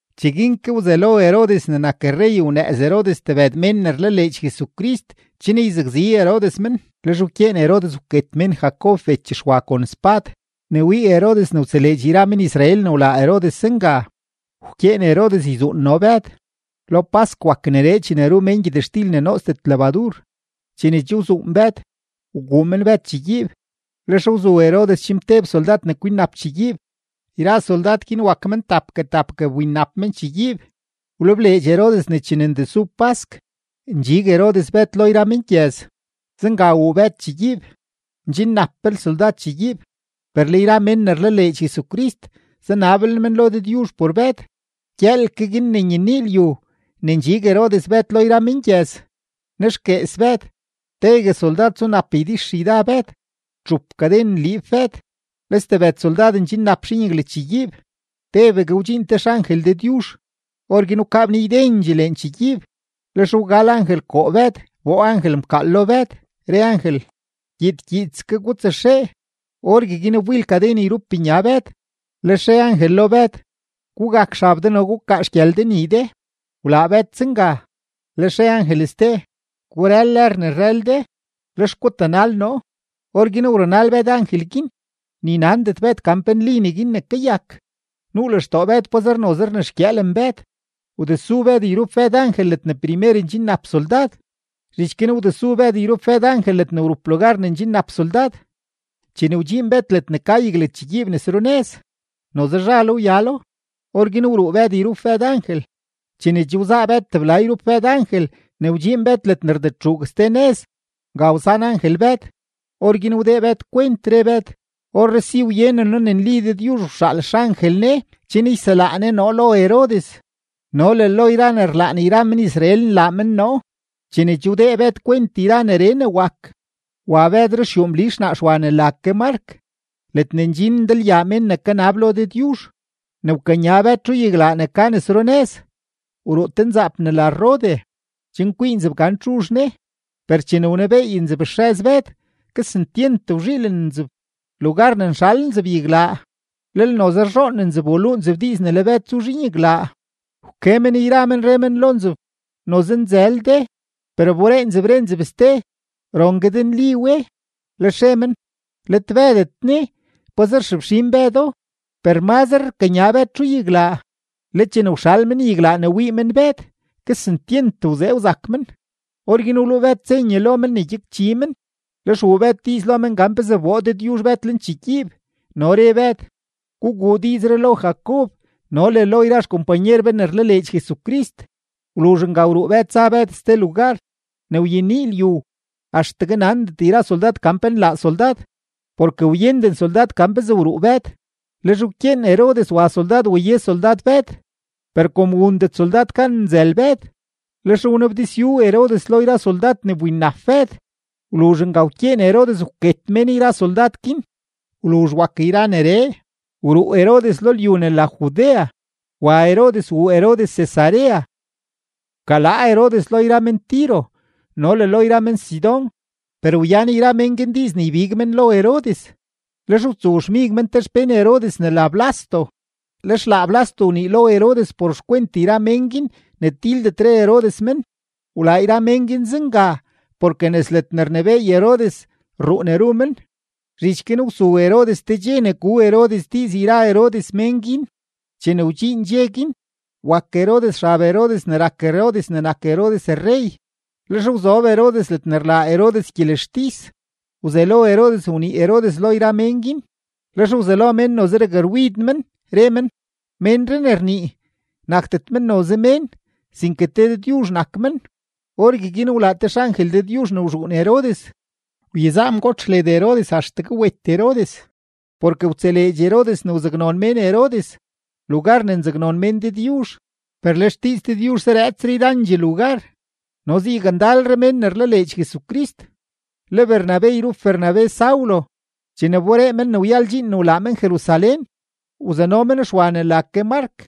Cheguin ke wzelo Herodes ne nak rrey wnëëz Herodes tebëd mén ne rlaleedx Jesucrist, chen yzakzi Herodes men. Lex wkyeen Herodes wket mén Jacob bech Xwa kon spad. Ne wii Herodes ne wtseleedx yra men-Israel ne wlaa Herodes zenga, wkyeen Herodes yzuun no Bëd. Lo pask wak neree chene ru mén gyëtxtil ne nootsdet lebadur. Chene che wzuun Bëd, wguu men Bëd chegyiib, lex wzu Herodes chimteb soldad ne kwinnap chegyiib; yra soldad guin wak men tapgue tapgue wbinnap men chegyiib. Wlebleedx Herodes ne chene ndesu pask, ndxig Herodes Bëd lo yra mengyëz. Zenga wuu Bëd chegyiib, ndxinnaplel soldad chegyiib, per le yra mén ne rlaleedx Jesucrist, zanablel men lo Dëdyuzh por Bëd. Gyëël ke guin ne nyenii lyu ne ndxig Herodes Bëd lo yra mengyëz, nexguees Bëd; tegue soldad zunap ydixyda Bëd, txup kaden nliib Bëd, le stebëd soldad ndxinnap zhinyaglachegyiib. Tebegue wdxiin te xangel Dëdyuzh; orguin wkaa bnii ydendxee lenchegyiib, lex wgal angel koo Bëd wboo angel mkaal lo Bëd, re angel: ―Gyiid gyiidske gutsaxee. Orgueguin wbil kaden yrup nya Bëd. Lex re angel lo Bëd: ―Gugak xab de no gukaa xgyël de nii de. Wlaa Bëd zenga, lex re angel ste: ―Gurël lër ne rrël de, lex gutanal noo. Orguin wrunal Bëd angel guin, ni nandet Bëd gan pe nli neguin ne kayak. Nuu lextoo Bëd pazer noze rnexgyëëlen Bëd. Wdesu Bëd yrup Bëd angel ledne primer ndxinnap soldad; zhich guin wdesu Bëd yrup Bëd angel ledne wrup lugar ne ndxinnap soldad. Chene wdxiin Bëd ledne ka yaglagyiib nes runëz, noze zhalo wyalo. Orguin wruu Bëd yrup Bëd angel. Chene che wzaa Bëd tebla yrup Bëd angel ne wdxiin Bëd ledne rdetxuug ste nëz, nga wsan angel Bëd. Orguin wdee Bëd kwent, re Bëd: ―Orree si wyenen noo ne nli Dëdyuzh wxaal xangel Ne chen yselaa Ne noo lo Herodes no le lo yra ne rlaan yra men-Israel nlaa men noo. Chene che wdee Bëd kwent yra neree ne wak, wa Bëd ruxyuu Mli xnaa Xwa ne la ke Mark, ledne ndxin ndalyaa mén ne kanab lo Dëdyuzh. Ne wkanya Bëd txuyaglaa ne ka nes runëz, wruu te nzaap ne la Rode, chen kwii nzeb gan txuzh ne. Per chene wnebeey nzeb xrëz Bëd, kesentyent wzhiilen nzeb; lugar ne nxal nzeb yaglaa, lel noze rzhoon nzeb waluu nzeb diiz ne le Bëd zu zhiin yaglaa. Wke men yra men, re men lo nzeb: ―¡Noze nzël de! Per wberee nzeb re nzeb ste: ―Rongue de nli we. Lex re men: ―Let Bëdet ne; pazer xefxin Bëdo. Per mazre rkanya Bëd txuyaglaa, le chene wxal men yaglaa ne wii men Bëd, kesentyent wzee wzak men. Orguin wluu Bëd senye lo men ne gyakchi men, lex wuu Bëd diiz lo men gan pezee wboo Dëdyuzh Bëd lenchegyiib, no re Bëd: ―Guguu diizree lo Jacob no le lo yra xkompanyer be ne rlaleedx Jesucrist. Wluzh nga wruu Bëd za Bëd ste lugar. Ne wyenii lyu axtegue nandet yra soldad gan pe nlaa soldad, porke wyenden soldad gan pezee wruu Bëd. Lex wkyeen Herodes wa soldad waye soldad Bëd, per kom wundet soldad gan nzël Bëd, lex wnabdizyu Herodes lo yra soldad ne wbinnap Bëd; wluzh nga wkyeen Herodes wket mén yra soldad guin. Wluzh wak yra neree, wruu Herodes lo lyu ne la Judea, wa Herodes wuu Herodes Cesarea. Wkalaa Herodes lo yra men-Tiro no le lo yra men-Sidón, per wyan yra mén guin diiz ne ybig men lo Herodes, lex wtsowxmig men te xpén Herodes ne la Blasto, lex laa Blasto wnii lo Herodes por xkwent yra men guin ne tildetre Herodes men. Wlaa yra mén guin zenga porke nes ledne rnebééy Herodes rruu ne ru men. Zhich guin wsu Herodes te dxe ne gu Herodes diiz yra Herodes mén guin. Chene wdxiin dxe guin, wak Herodes xab Herodes ne rak Herodes ne nak Herodes rrey, lex wzob Herodes ledne rlaa Herodes gyelextis, wzelo Herodes wnii Herodes lo yra mén guin. Lex wzelo mén noze rakrwid men, re men: ―¡Ménree ne rnii, nakdet men noze mén, sinke te dëdyuzh nak men! Orgueguin wlaa te xangel Dëdyuzh ne wzhuun Herodes, wyezaa mgotx led Herodes axtegue wet Herodes, porke wtseleedx Herodes ne wzaknon mén Herodes, lugar ne nzaknon mén Dëdyuzh. Per le xdiiz Dëdyuzh zarëëtsre yrandxee lugar, no zayakndalre mén ne rlaleedx Jesucrist. Le Bernabe yrup Bernabe Saulo, chene wberee men ne wyal dxiin ne wlaa men Jerusalén, wzano men Xwa ne la ke Mark,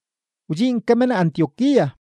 wdxiin ke men Antioquía.